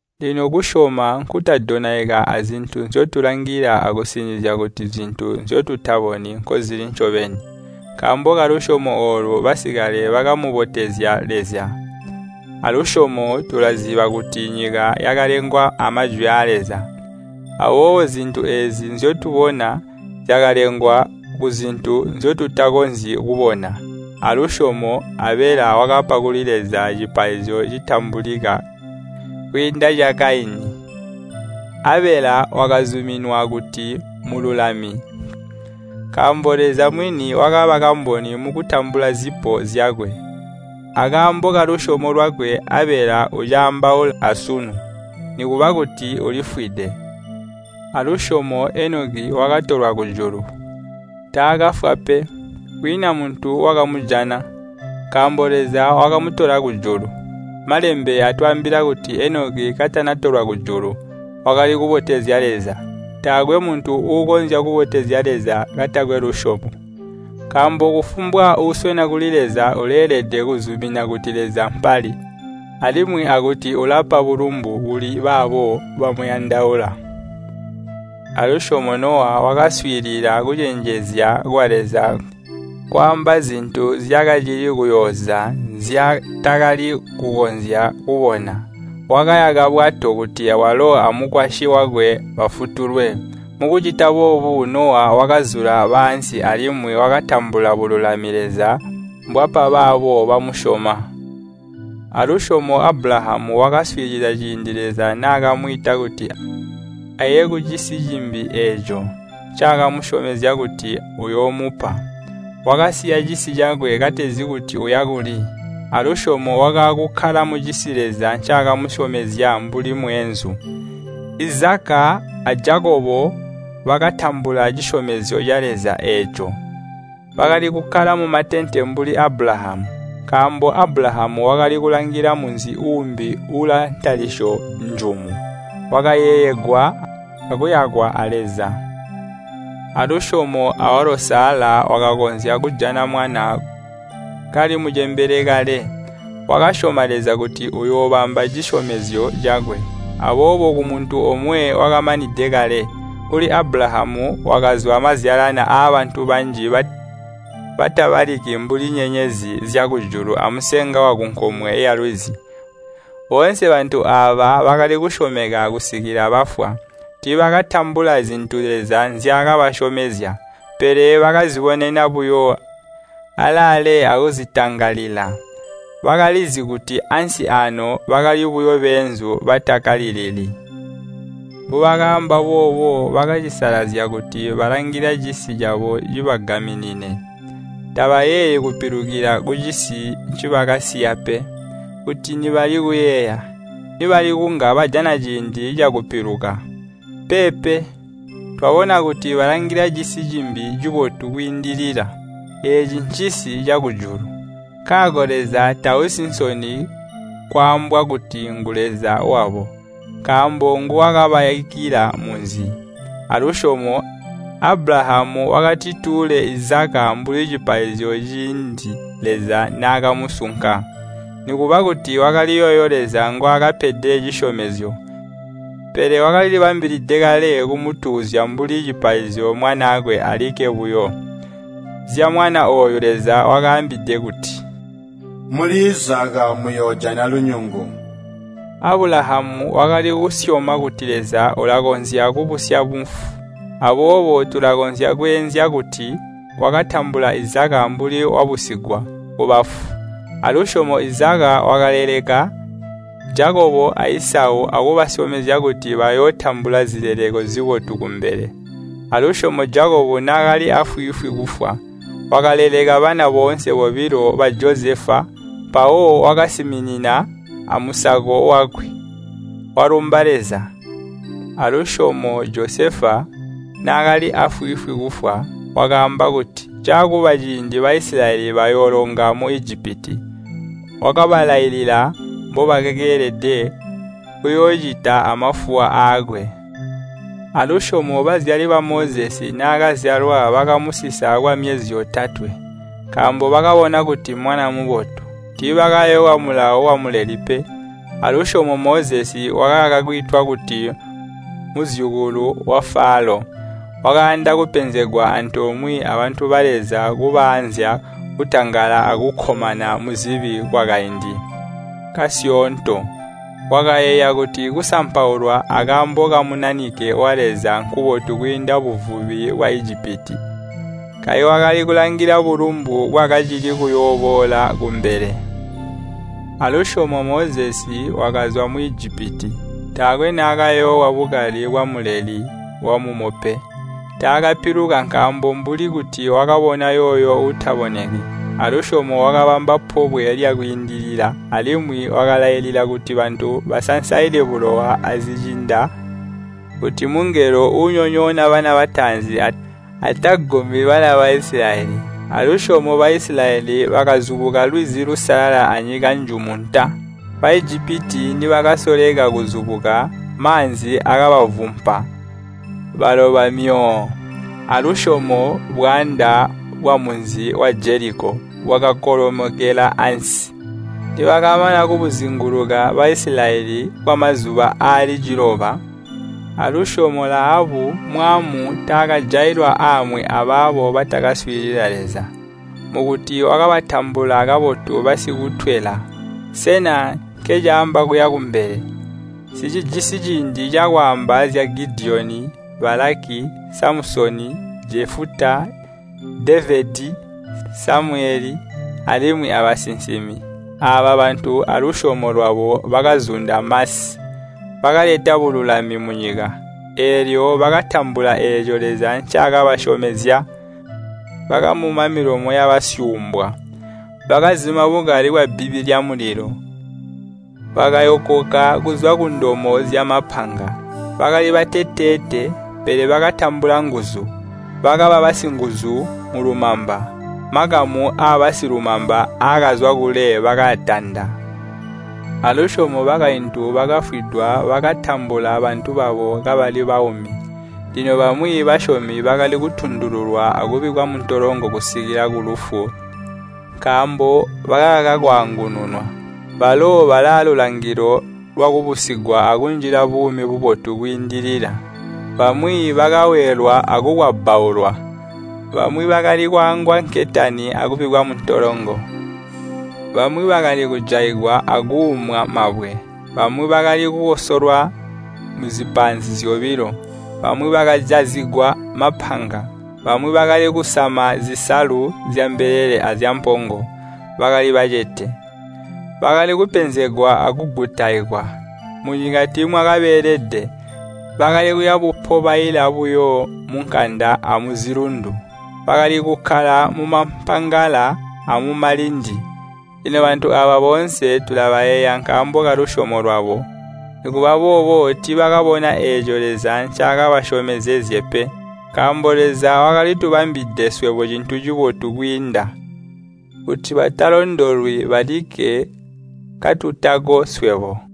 Lino kusyoma nkutadonaika azintu nzyotulangila akusinizya kuti zintu nzyotutaboni nkozili ncobeni. Nkaambo kalusyomo oolu basikale bakamubotezya Leza. Alusyomo tulaziba kuti nyika yakalengwa amajwi aa Leza. Aboobo zintu eezi nzyotubona, zyakalengwa kuzintu nzyotutakonzyi kubona. Alusyomo Abela wakapa kuli Leza cipaizyo citambulika kwiinda ca Kaini. Abela wakazuminwa kuti mmululami nkaambo Leza mwini wakaba kamboni mukutambula zipo zyakwe. Akaambo kalusyomo lwakwe Abela ucaambaula asunu, nikuba kuti ulifwide. Alusyomo Enoki wakatolwa kujulu, taakafwa pe. Kwiina muntu wakamujana, nkaambo Leza wakamutola kujulu. Malembe atwaambila kuti Enoki katanatolwa kujulu, wakali kubotezya Leza. Taakwe muntu uukonzya kubotezya Leza katakwe lusyomo. Nkaambo kufumbwa uuswena kuli Leza uleelede kuzumina kuti Leza mpali, alimwi akuti ulapa bulumbu kuli baabo bamuyandaula. Alusyomo Nowa wakaswiilila kucenjezya kwa Leza kwaamba zintu zyakacili kuyooza nzyaatakali kukonzya kubona. Wakayaka bbwato kuti walo amukwasyi wakwe bafutulwe. Mukucita boobo Nowa wakazula baansi alimwi wakatambula bululami Leza mbwapa baabo bamusyoma. Alusyomo Abulahamu wakaswiilila ciindi Leza naakamwiita kuti aye kucisi cimbi eeco ncaakamusyomezya kuti uyoomupa. Wakasiya cisi cakwe katezi kuti uya kuli. Alusyomo wakaakukkala mucisi Leza ncaakamusyomezya mbuli mweenzu. Izaka a Jakobo bakatambula cisyomezyo ca Leza eeco, bakali kukkala mumatente mbuli Abulahamu. Nkaambo Abulahamu wakali kulangila munzi uumbi uulaantalisyo njumu, wakayeeyegwa akuyakwa a Leza. Alusyomo awalo Sala wakakonzya kujana mwana kali mucembele kale. Wakasyoma Leza kuti uyoobamba cisyomezyo cakwe. Aboobo kumuntu omwe wakamanide kale, kuli Abulahamu kwakazwa mazyalani aabantu banji batabaliki mbuli nyenyezi zyakujulu amusenga wakunkomwe yalwizi. Boonse bantu aaba bakali kusyomeka kusikila bafwa. Tiibakatambula zintu Leza nzyaakabasyomezya, pele bakazibonena buyo alaale akuzitangalila. Bakalizi kuti ansi aano bakali buyo beenzu batakkalilili. Mbubakaamba boobo bakacisalazya kuti balangila cisi cabo cibagaminine. Tabayeeyi kupiluka kucisi ncibakasiya pe. Kuti nibali kuyeeya, nibali kunga bajana ciindi cakupiluka. Peepe, twabona kuti balangila cisi cimbi cibotu kwiindilila, eeci ncisi cakujulu. Nkaako Leza tausi nsoni kwaambwa kuti ngu Leza wabo, nkaambo nguwakabayakila munzi. Alusyomo Abulahamu wakatituule Izaka mbuli cipaizyo ciindi Leza naakamusunka. Nikuba kuti wakali yooyo Leza ngwaakapede cisyomezyo, pele wakalilibambilide kale kumutuuzya mbuli cipaizyo mwanaakwe alikke buyo. Zyamwana ooyo Leza wakaambide kuti, “Muli Izaka moyoojana lunyungu.” Abulahamu wakali kusyoma kuti Leza ulakonzya kubusya mufu. Aboobo tulakonzya kweezya kuti wakatambula Izaka mbuli wabusigwa kubafu. Alusyomo Izaka wakaleleka Jakobo a Isau akubasyomezya kuti bayootambula zileleko zibotu kumbele. Alusyomo Jakobo naakali aafwiifwi kufwa, wakaleleka bana boonse bobilo ba Josefa, mpawo wakasiminina amusako wakwe, walumba Leza. Alusyomo Josefa, naakali aafwiifwi kufwa, wakaamba kuti caakuba ciindi Baisilayeli bayoolonga mu Ijipiti. Wakabalailila mbobakeelede kuyoocita amafuwa aakwe. Alusyomo bazyali ba Mozesi naakazyalwa bakamusisa kwamyezi yotatwe, nkaambo bakabona kuti mwana mubotu. Tiibakayoowa mulawo wamuleli pe. Alusyomo Mozesi wakakaka kwiitwa kuti muzyukulu wa Falo. Wakayanda kupenzegwa antoomwe abantu ba Leza kubaazya kutangala akukkomana muzibi kwakaindi kasyoonto. Wakayeeya kuti kusampaulwa akaambo ka Munanike wa Leza nkubotu kwiinda buvubi bwa Ijipiti. Kayi wakali kulangila bulumbu bwakacili kuyooboola kumbele. Alusyomo Mozesi wakazwa mu Ijipiti, taakwe naakayoowa bukali bwamuleli wamumo pe. Taakapiluka nkaambo mbuli kuti wakabona yooyo uutaboneki. Alusyomo wakabamba Pobwe lya Kwiindilila, alimwi wakalailila kuti bantu basansaile bulowa azicinda kuti mungelo uunyonyoona bana bataanzi atagumi bana ba Baisilayeli. Alusyomo Baisilayeli bakazubuka Lwizi Lusalala anyika njumu nta. Baijipiti nibakasoleka kuzubuka, maanzi akabavuppa baloba myoo! Alusyomo bwaanda bwamunzi wa Jeliko bwakakolomokela ansi, nibakamana kubuzinguluka Baisilayeli kwamazuba aali ciloba. Alusyomo Lahabu mwaamu taakajailwa aamwi abaabo batakaswiilila Leza, mukuti wakabatambula kabotu basikutwela. Sena nkencaamba kuya kumbele? Nsicijisi ciindi cakwaamba zya Gidiyoni, Balaki, Samusoni, Jefuta, Devedi, Samuyele, alimwi abasinsimi. Aaba bantu alusyomo lwabo bakazunda masi, bakaleta bululami munyika, eelyo bakatambula eeco Leza ncaakabasyomezya. Bakamuma milomo yabasyuumbwa. Bakazima bukali bwabbibi lyamulilo, bakayokoka kuzwa kundomo zyamapanga. Bakali bateteete, pele bakatambula nguzu. Bakaba basinguzu mulumamba, makamu aabasilumamba aakazwa kule bakaatanda. Alusyomo bakaintu bakafwidwa bakatambula bantu babo kabali baumi. Lino bamwi basyomi bakali kutundululwa akubikkwa muntolongo kusikila kulufu nkaambo bakakaka kwaangununwa. Balo balaalulangilo lwakubusigwa akunjila buumi bubotu kwiindilila. Bamwi bakaweelwa akukwabbaulwa. Bamwi bakali kwaangwa nketani akubikkwa muntolongo. Bamwi bakali kujaigwa akuumwa mabwe, bamwi bakali kukosolwa muzipaanzi zyobilo, bamwi bakajazigwa mapanga. Bamwi bakali kusama zisalu zyambelele azyampongo, bakali bacete, bakali kupenzegwa akugutaikwa. Munyika tiimwakabeelede, bakali kuya bupobaila buyo munkanda amuzilundu. Bakali kukkala mumampangala amumalindi. Lino bantu aaba boonse tulabayeeya nkaambo kalusyomo lwabo. Nikuba boobo tiibakabona eeco Leza ncaakazyomezezye pe. Nkaambo Leza wakali tubambilide swebo cintu cibotu kwiinda, kuti batalondolwi balikke katutako swebo.